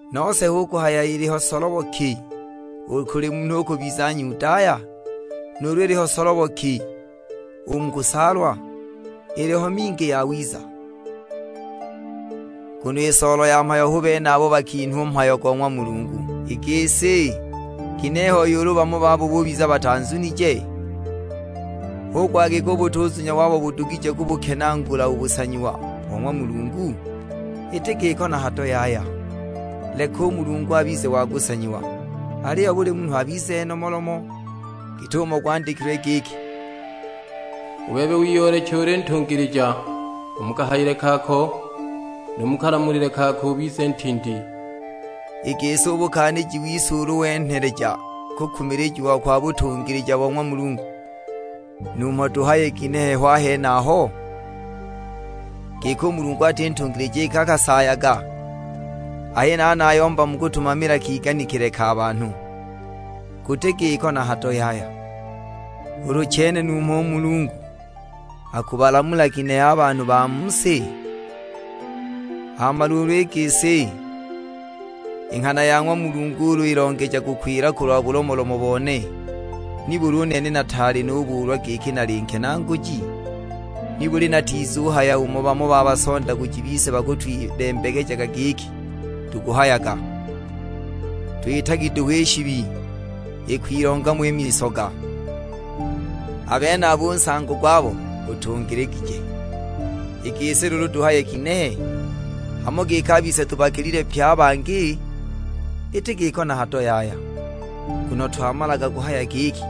Nose hu kuhaya iliho solobo ki u kuli munhu u kubiza Nyudaya? Nuulu iliho solobo ki u mu kusaalwa? Iliho mingi i yawiza; nguno i soolo ya mhayo hu bene abo bakinhwa u mhayo go ng'wa Mulungu. I gisi, ginehe hoi ulu bamo babo bubiza batazunije? Hu kuhaya giki u butuzunya wabo budugije kubukenaagula u busanyiwa bo ng'wa Mulungu? Iti giko na hado yaya! Leka u Mulungu abize wa kusanyiwa, aliyo buli munhu abize nomolomo, git'umo gwandikilwe giki, "U bebe wiyooleche uli ntungilija u mu kahayile kaako, nu mu kalamulile kaako ubize ntindi." I gisi u bukenaaguji wise ulu wenheleja kukumilijiwa kwa butungilija bo ng'wa Mulungu, numho tuhaye ginehe ho a henaho? Giki u Mulungu ati ntungilija iki akasaayaga? (A henaha nayomba mu kutumamila kiganikile ka banhu). Guti giko na hado yaya! Ulu chene numho u Mulungu akubalamula ginehe a ba mu si? Hama luulu i gisi, i nghana ya ng'wa Mulungu ulu ilongeja kukwila kulwa bulomolomo bone, nibuli u nene nataali nubuulwa giki nali nkenaaguji? Nibuli natizuhaya umo bamo ba basondaguji bise bakutwilembekejaga giki tukuhayaga, "Twitagi duhu i shibi, ikwilonga mo i misoga!" A benabo u nsango gwabo gutungiligije! I gisi luulu tuhaye ginehe? Hamo giki a bise tubakilile pye a bangi? Iti giko na hado yaya; nguno twamalaga kuhaya giki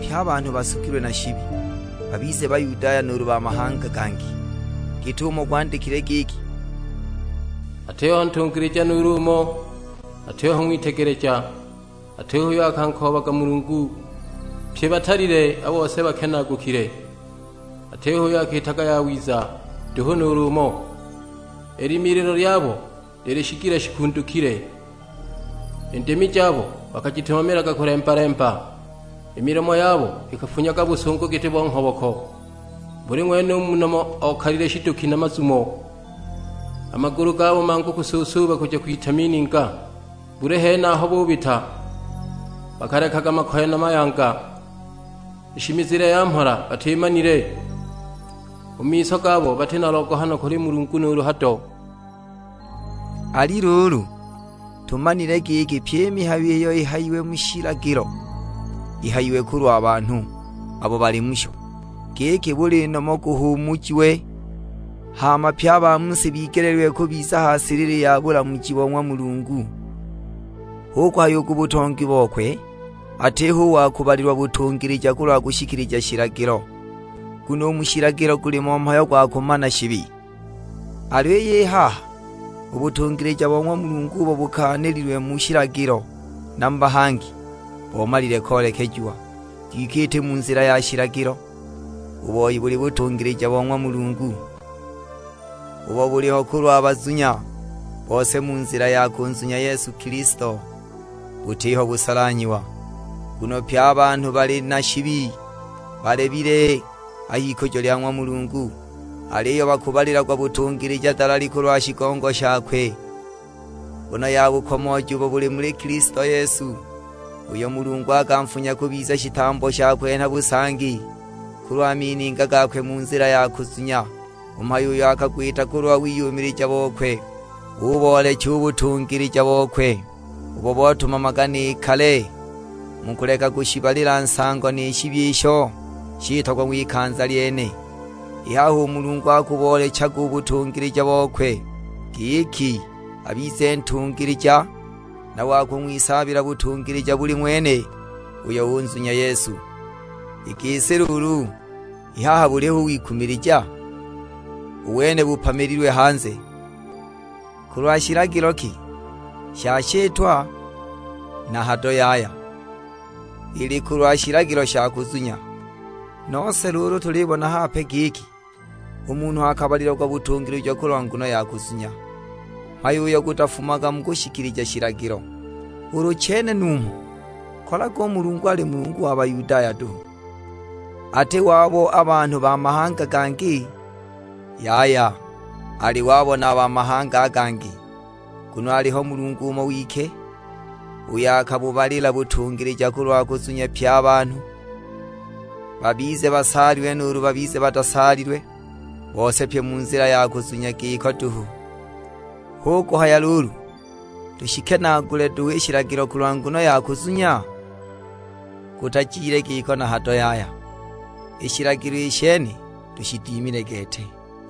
pye a banhu basugilwe na shibi, babize Bayudaya nuulu ba mahanga gangi Nuulu: Bayunani.'! Git'umo gwandikilwe giki, "Atiho ntungilija nuulu umo, atiho ng'witegeleja, atiho uyo akankoobaga Mulungu. Pye batalile, a bose bakenaagukile, atiho uyo akiitaga yawiza, nduhu nuulu umo! I limililo lyabo lili shigila shikundukile, i ndimi jabo bakajitumamilaga kulemba-lemba; i milomo yabo ikafunyaga busungu giti bo nghoboko. Buli ng'wene u mu nomo okalile shiduki na mazumo. A magulu gabo mangu kusuusuuba kuja kwita mininga. Buli hene aho bubita bakalekaga makoye na mayanga; i shimizile ya mhola batimanile. U mu miso gabo bati na logohano kuli Mulungu nuulu hado!" Ali luulu, tumanile giki pyi i mihayo iyo ihayiwe mu shilagilo, ihayiwe kulwa banhu abo bali musho, giki buli nomo guhuumujiwe, hama pye a ba mu si bigeleelwe kubiza ha silili ya bulamuji bo ng'wa Mulungu. Hu kuhaya u ku butongi bokwe atiho u wa kubalilwa butungilija kulwa kushikilija shilagilo; nguno u mu shilagilo gulimo mhayo gwa kumana shibi. Aliyo i haha, u butungilija bo ng'wa Mulungu ubo bukaanililwe mu shilagilo na mu bahangi, bomalile koolechiwa; kwike iti mu nzila ya shilagilo. U boi buli butungilija bo ng'wa Mulungu, ubo buliho kulwa bazunya bose mu nzila ya kunzunya Yesu Kilisto; butiho busolanhyiwa. Nguno pye a banhu bali na shibi, balebile a h'ikujo lya ng'wa Mulungu. Aliyo bakubalilagwa butungilija dalali kulwa shigongo shakwe, nguno ya bukomooji ubo buli muli Kilisto Yesu; uyo Mulungu akanfunya kubiza shitambo sha kwenha busangi kulwa mininga gakwe mu nzila ya kuzunya, u mhayo uyo akagwita kulwa wiyumilija bokwe, uboolecha u butungilija bokwe ubo botumamaga ni kale mu kuleka kushibalila nsango ni shibi isho shitagwa ng'wikanza lyene. I haha u Mulungu akuboolechaga u butungilija bokwe, giki abize ntungilija na wa kung'wisaabila butungilija buli ng'wene uyo unzunya Yesu. I gisi luulu, i haha buli hali u wikumilija? U wene bupamililwe hanze. Kulwa shilagilo ki, sha shitwa? Na hado yaya, ili kulwa shilagilo sha kuzunya. Nose luulu tulibona hape giki, u munhu akabalilagwa butungilija kulwa nguno ya kuzunya, mhayo uyo gutafumaga mu kushikilija shilagilo. Ulu chene numho kolaga u Mulungu ali Mulungu wa Bayudaya duhu, ati wabo a banhu ba mahanga a gangi? Yaya, ali wabo na a ba mahanga a gangi! Nguno aliho Mulungu umo wike; uyo akubabalila butungilija kulwa kuzunya pye a banhu; babize basaalilwe nuulu babize batasaalilwe, bose pye mu nzila ya kuzunya giko duhu. Hu kuhaya luulu tushikenaagule duhu i shilagilo kulwa nguno ya kuzunya? Gutajile giko na hado yaya, i shilagilo i shene tushidimile gete.